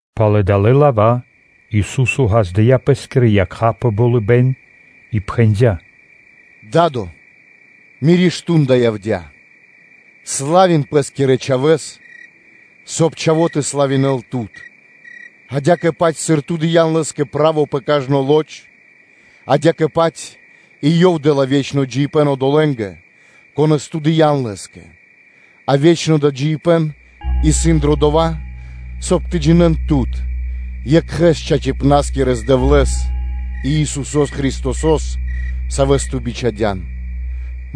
Пало́ далэ́ лава́ Ису́со ґаздыя́ пэ́скирэ якха́ пэ болыбэ́н и пхэндя́: “Да́до! Миро мардо́ (часо) явдя́: славин Пэ́скирэ Чхавэ́с, соб (кай) Чхаво́ тэ славинэл Тут, адя́кэ-паць, сыр Ту дыя́н Лэ́скэ право пэ кажно лоч (плоть), адя́кэ-паць и Ёв дэ́ла ве́чно джиибэ́н одолэ́нгэ, конэ́с Ту дыя́н Лэ́скэ. А ве́чно джиибэ́н исын дро дова́, соб (кай) тэ джинэ́н Тут, Екхэ́с Чачипнаскирэ Дэвлэ́с, и Исусо́с Христосо́с, Савэс Ту бичхадян.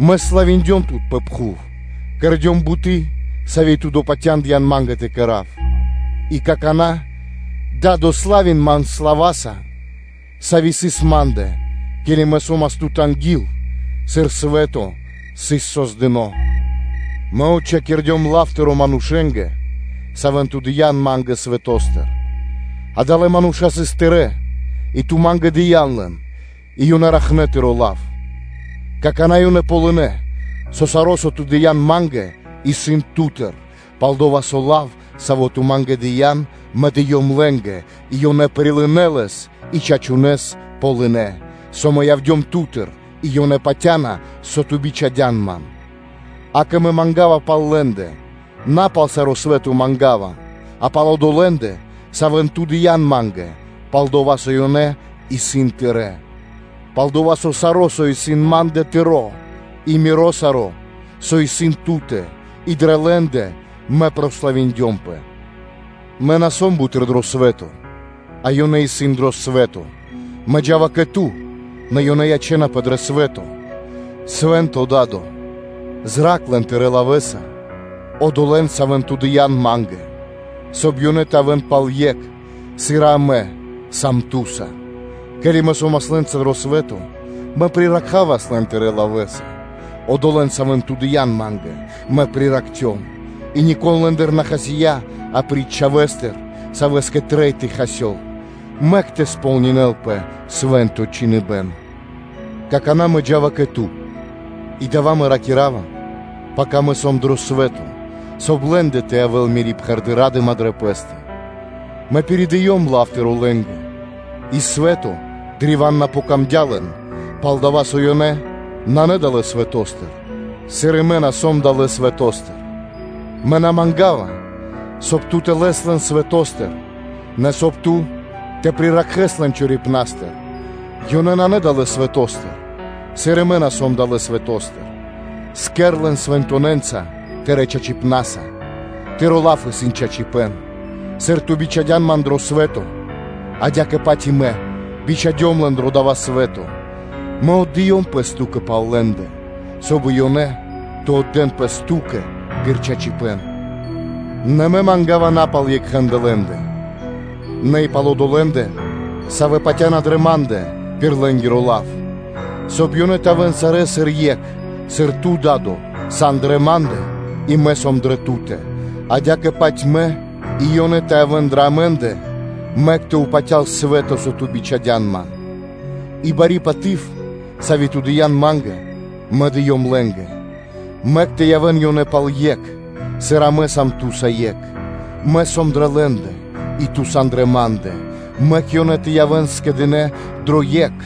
Мэ славиндём Тут пэ пхув, кэрдём буты́, сави́ Ту допатяндыян Ма́нгэ тэ кэра́в. И какана́, Да́до, славин Ман слава́са, сави́ сыс Ма́ндэ, ке́ли Мэ со́мас Ту́тэ анги́л, сыр свэ́то сыс создыно́. Мэ отчхакирдём лав Тыро́ манушэ́нгэ, савэ́н Ту дыя́н Ма́нгэ свэто́стыр. Адалэ́ мануша́ сыс Тырэ́, и Ту Ма́нгэ дыя́н лэн, и ёнэ ракхнэ Тыро́ лав. Какана́ ёнэ ґалынэ́, со саро́, со Ту дыя́н Ма́нгэ, исын Ту́тыр; пал-дова́ со лав, саво́ Ту Ма́нгэ дыя́н, Мэ дыём лэ́нгэ, и ёнэ прилынэ́ лэс и чачунэ́с ґалынэ́, со Мэ явдём Ту́тыр, и ёнэ патя́на, со Ту бичхадян Ман. Акэ, Мэ манга́ва пал лэ́ндэ: На пал саро́ свэ́то манга́ва, а пал одолэ́ндэ, савэ́н Ту дыя́н Ма́нгэ, пал-дова́ со ёнэ исын Тырэ́. Пал-дова́ со саро́, со исын Ма́ндэ-Тыро́, и Миро саро́, со исын Ту́тэ, и дрэ лэ́ндэ Мэ прославиндёмпэ. Мэ на сом буты́р дро свэ́то, а ёнэ исын дро свэ́то. Мэ джа́ва кэ Ту, нэ ёнэ ячэ́напэ дро свэ́то. Свэ́нто Да́до! Зра́кх лэн Тырэ́ лавэ́са, одолэ́н, савэ́н Ту дыя́н Ма́нгэ, соб (кай) ёнэ тэ явэ́н пал екх, сыр и Амэ сам Ту́са. Ке́ли Мэ со́мас лэ́нца дро свэ́то, Мэ приракхавас лэн Тырэ́ лавэ́са; одолэ́н, савэ́н Ту дыя́н Ма́нгэ, Мэ приракхцём, и нико́н лэ́ндыр на хасия́ апри́ч чхавэ́стэ, савэ́скэ трэй тэ хасёл, мэк тэ сполнинэ́лпэ Свэ́нто Чхиныбэ́н. Какана́ Мэ джа́ва кэ Ту, и дава́ Мэ ракира́ва, пака Мэ сом дро свэ́то, соб (кай) лэ́ндэ тэ явэ́л Мири́ пхэрды́ ра́дыма дрэ пэ́стэ. Мэ пиридыём лав Тыро́ лэ́нгэ, и свэтоскэ сыс древа́н на пир ило́, пал-дава́ со ёнэ нанэ далэ́ свэто́стыр, сыр и Мэ на сом далэ́ свэто́стыр. Мэ на манга́ва, соб (кай) Ту тэ лэс лэн свэто́стыр, нэ соб (кай) Ту тэ приракхэс лэн чорипна́стыр; ёнэ исын на далэ́ свэто́стыр, сыр и Мэ на сом далэ́ свэто́стыр. Кэр лэн свэнтонэнца Тырэ́ чачипна́са. Тыро́ лав исын чачипэ́н. Сыр Ту бичхадян Ман дрэ свэ́то, адя́кэ-паць и Мэ бичхадём лэн дро дава́ свэ́то. Мэ отдыём пэс Ту́кэ пал лэ́ндэ, соб (кай) и ёнэ тэ отдэ́н пэс Ту́кэ пир чачипэ́н. Нэ Мэ манга́ва на пал екхэндэ лэ́ндэ, нэ и пал одолэ́ндэ, савэ́ патя́на дрэ Ма́ндэ пир лэ́нгиро лав; соб (кай) ёнэ тэ явэ́н сарэ́ сыр екх, сыр Ту, Да́до, сан дрэ Ма́ндэ, и Мэ сом дрэ Ту́тэ, адя́кэ-паць Мэ и ёнэ тэ явэ́н дрэ Амэ́ндэ, мэк тэ упатял свэ́то, со Ту бичхадян Ман. И бари паты́в, сави́ Ту дыя́н Ма́нгэ, Мэ дыём лэ́нгэ: мэк тэ явэ́н ёнэ пал екх, сыр Амэ сам Ту́са екх. Мэ сом дрэ лэ́ндэ, и Ту сан дрэ Ма́ндэ; мэк ёнэ тэ явэ́н скэдынэ́ дро екх,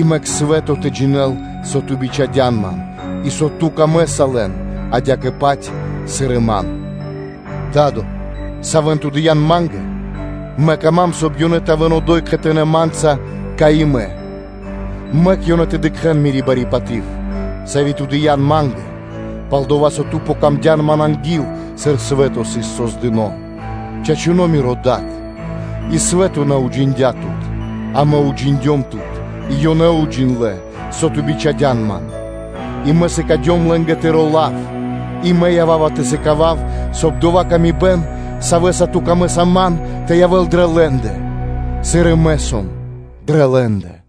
и мэк свэ́то тэ джинэ́л, со Ту бичхадян Ман, и со Ту́кэ ёнэ исын дро́га, адя́кэ-паць, сыр и ёнэ ячнэ́ дро́га Ма́нгэ. Да́до! Савэ́н Ту дыя́н Ма́нгэ, ёнэ ячнэ́ дро́га Ма́нгэ, соб (кай) ёнэ тэ явэ́н одо́й кхэтанэ́ Ма́нца, кай и Мэ; мэк ёнэ тэ дыкхэ́н Мири́ бари паты́в, сави́ Ту дыя́н Ма́нгэ, пал-дова́ со Ту́кэ Мэ яцём дро́го анги́л, сыр свэ́то сыс создыно́. Чачуно́ Миро Да́до! И свэ́то на уджиндя́ Тут: а Мэ уджиндём Тут, и ёнэ уджиндлэ́, со Ту бичхадян Ман; и Мэ сыкадём лэ́нгэ Тыро́ лав и Мэ ява́ва тэ сыкавав, соб (кай) доя́ ла́ска, сави́ исын Ту́тэ кэ Мэ, тэ явэ́л дрэ лэ́ндэ, сыр и Мэ сом дрэ лэ́ндэ.”